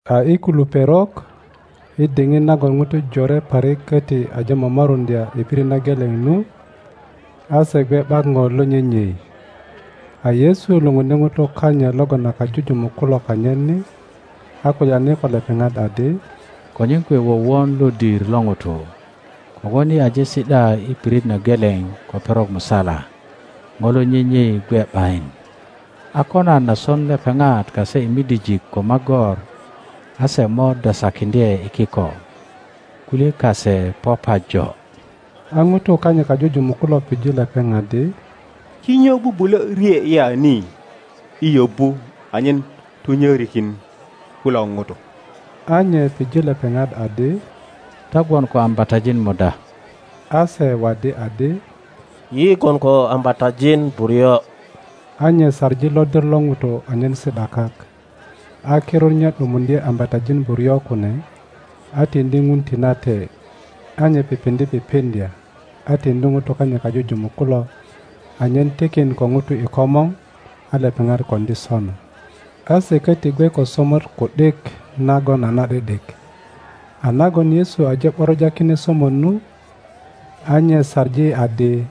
A i kilu perok i diŋit nagon ŋutu jore parik köti aje momoruŋdya i pirit na geleŋ nu, a se gwe ’bak ŋo lo nyenyei. A Yesu lupundye ŋutu kanyit logon a kajujumuk kulo kanyit ni, a kulyani ko lepeŋat adi, Konyen kwe wowon lodir lo ŋutu, kogwon yi aje si ’da i pirit na geleŋ ko perok musala, ŋo lo nyenyei gwe ’bayin; a ko nan a son lepeŋat kase i midijik ko magor, a se mo dosakiŋdye i kiko; kulye kase po pajo. A ŋutu kanyit kajujumuk kulo pije lepeŋ adi, Kinyo bubulö rye ya ni i yobu anyen tunyörikin kulo ŋutu? A nye pije lepeŋat adi, Ta gwon ko ambatajin muda? A se waddi adi, Yi gwon ko ambatajin buryo. A nye saŋi lodir lo ŋutu anyen si ’da kak; a kirut nye ’dumuŋdye ambatajin buryo kune, a tiŋdi Ŋun tinate, a nye pipiŋdye pipiŋdya, a tiŋdi ŋutu kanyit kajujumuk kulo, anyen tikin ko ŋutu i komor; a lepeŋat koŋdi sona. A se köti gwe ko somot ku ’dik nagon a na ’di ’dik, a nagon Yesu aje ’boroja kine somot nu, a nye saŋi adi,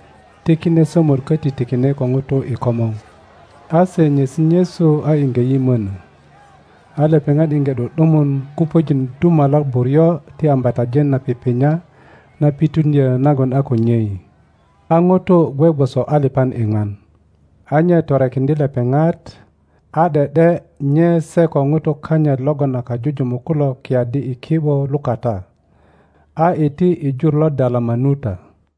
ti kine somot köti tikine ko ŋutu i komor. A se nyesi nyesu a iŋge yimönö. A lepeŋat iŋge ’du ’dumun kupöjin dumalak buryo ti ambatajin na pipinya na pituŋdyö nagon a ko nyei. A ŋutu gwe gwoso alipan iŋwan. A nye torekiŋdye lepeŋat, a ’de ’de nye se ko ŋutu kanyit logon a kajujumuk kulo kiyaddi i ki ’bo lukata, a iti i jur lo Dalamanuta.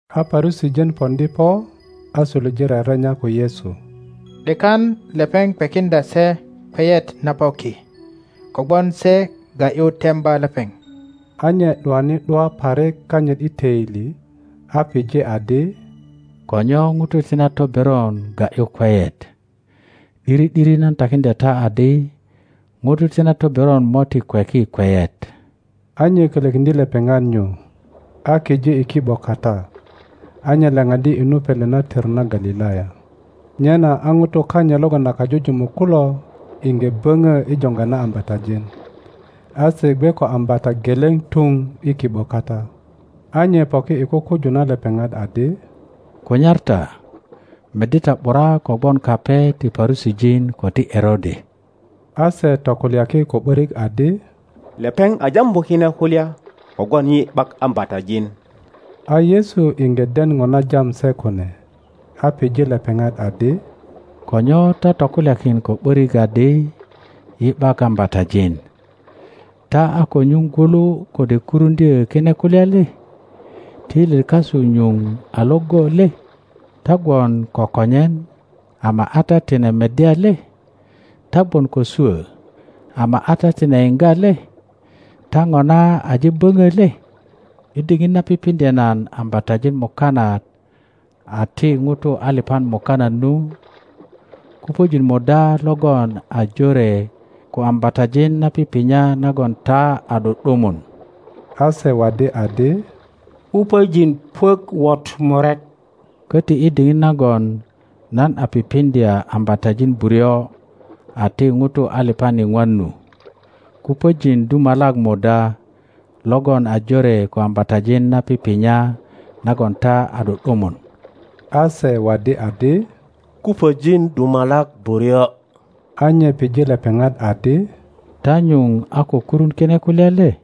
A Parusijin poŋdi po a suluje rerenya ko Yesu, ’dekan lepeŋ kwekindya se kweyet na po ki, kogwon se ga ’yu temba lepeŋ. A nye ’duani ’dua parik kanyit i töili, a pije adi, Ko nyo ŋutu ti na toberon ga ’yu kweyet? ’Diri ’diri nan takiŋdya ta adi, ŋutu ti na toberon mo ti kweki kweyet. A nye kölökiŋdye lepeŋat nyu, a kije i ki ’bo kata, a nye laŋaddi i nu pele na tör na Galilaya. Nyena a ŋutu kanyit logon a kajujumuk kulo iŋge böŋö i joŋga na ambatajin, a se gwe ko ambata geleŋ tuŋ i ki ’bo kata. A nye poki i kukuju na lepeŋat adi, Kunyar ta, meddi ta ’bura kogwon kape ti Parusijin ko ti Erode. A se tokulyaki ko ’börik adi, Lepeŋ a jambu kine kulya kogwon yi ’bak ambatajin. A Yesu iŋge den ŋo na jam se kune, a pije lepeŋat adi, Ko nyo ta tokulyakin ko ’börik adi, Yi ’bak ambatajin? Ta a ko nyuŋ gwulu kode kuruŋdyö kine kulya le? Toilyet kasu nyuŋ a iŋgo le? Ta gwon ko konyen, ama a ta tine meddya le? Ta gwon ko swo, ama a ta tine yiŋga le? Ta ŋona aje böŋö le? I diŋit na pipiŋdye nan ambatajin mukanat a ti ŋutu alipan mukanat nu, kupöjin muda logon a jore ko ambatajin na pipinya nagon ta a ’du ’dumun? A se waddi adi, Kupöjin puök wot murek. Koti, i diŋit nagon nan a pipiŋdya ambatajin buryo a ti ŋutu alipan iŋwan nu, kupöjin dumalak muda logon a jore ko ambatajin na pipinya nagon ta a ’du ’dumun? A se waddi adi, Kupöjin dumalak buryo. A nye pije lepeŋat adi, Ta nyuŋ a ko kurun kine kulya le?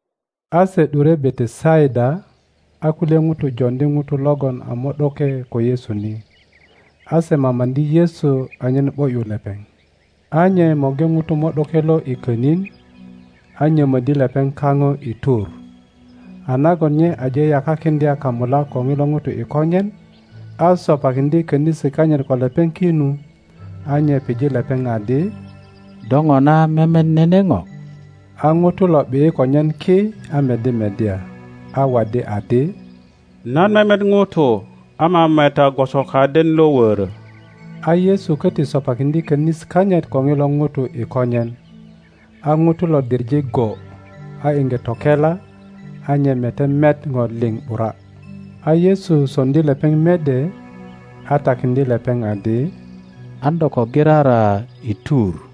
A se ’dure Betesaida, a kulye ŋutu joŋdi ŋuto logon a mo ’doke ko Yesu ni, a se mamaŋdi Yesu anyen ’bo ’yu lepeŋ. a nye morgi ŋuto mo ’doke lo i konin, a nyomöddi lepeŋ kaŋo i tur; a nagon nye aje yakakiŋdya kamulak ko ŋilo ŋuto i konyen, a sopakiŋdye könisi kanyit ko lepeŋ ki nu, a nye pije lepeŋ adi. Do ŋona memet nene ŋo? a ŋuto lo ’bi ’yi konyen ki a meddi meddya, a waddi adi, Nan memet ŋutu ama meta gwoso kaden lo wörö. a Yesu köti sopakiŋdye könisi kanyit ko ŋilo ŋuto i konyen, a ŋuto lo diŋe go, a iŋge tokela, a nye mete met ŋo liŋ ’bura. A Yesu soŋdi lepeŋ mede, a takiŋdye lepeŋ adi, An do ko girara i tur.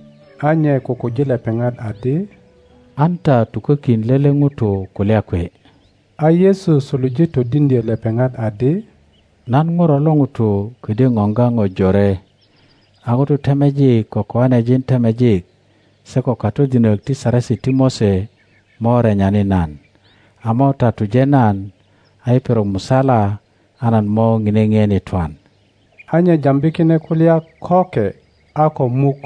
a nye kukuji lepeŋat adi, An ta tukokin lele ŋuto kulya kwe. A Yesu suluje todiŋdyö lepeŋat adi, Nan Ŋuro lo ŋuto ködyö ŋoŋga ŋo jore, a ŋutu temejik ko koanejin temejik se ko katodinök ti Saresi ti Mose mo renyani nan, a mo tatuje nan, a i perok musala a nan mo ŋine ŋien i twan. A nye jambi kine kulya köke a ko muk,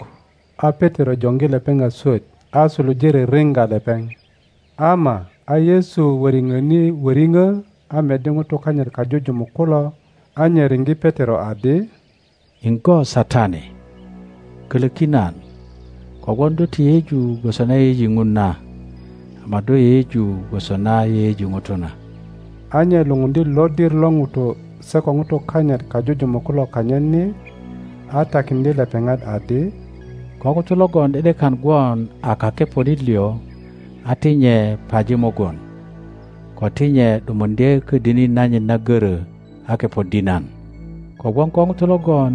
a Petero joŋgi lepeŋ a swöt, a suluje ririŋga lepeŋ. Ama a Yesu wöriŋoni wöriŋo, a meddi ŋutu kanyit kajujumuk kulo, a nye riŋge Petero adi, Iŋgo Satani! Koloki nan. Kogwon do ti yeyeju gwoso na yeyeji Ŋun na, ama do yeyeju gwoso na yeyeji ŋutu na. A nye lupundye lodir lo ŋutu se ko ŋutu kanyit kajujumuk kulo kanyit ni, a takiŋdye lepeŋat adi, Ko ŋuto logon ’de ’dekan gwon a kakeponit lio, a ti nye paji mugun, ko ti nye ’dumuŋdye ködini nanyit na görö a kepoddi nan. Kogwon ko ŋuto logon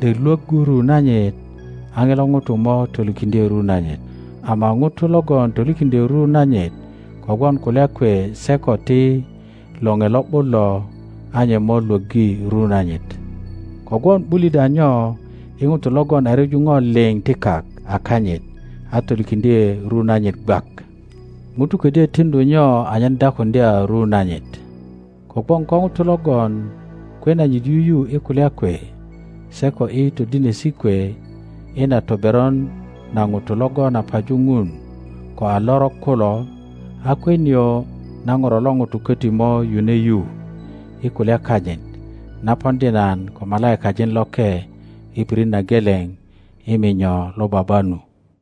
’dek lwöggu ru nanyit a ŋilo ŋuto mo tolikiŋdye ru nanyit, ama ŋuto logon tolikiŋdyö ru nanyit kogwon kulya kwe se ko ti Loŋe Lo ’but lo, a nye mo lwöggi ru nanyit. Kogwon ’bulit a nyo i ŋuto logon a ryeju ŋo liŋ ti kak a kanyit a tolikiŋdye ru nanyit gwak? ŋuto kodyö tiŋdu nyo anyen dakuŋdya ru nanyit? Kogwon ko ŋuto logon kwe nanyit yuyu i kulya kwe, se ko i todinesi kwe i na toberon na ŋutu logon a paju Ŋun ko a lorok kulo, a kwe nio na Ŋuro lo ŋuto köti mo yune yu i kulya kanyit, na poŋdi nan ko malaikajin loke i pirit na geleŋ i minyo lo Baba nu.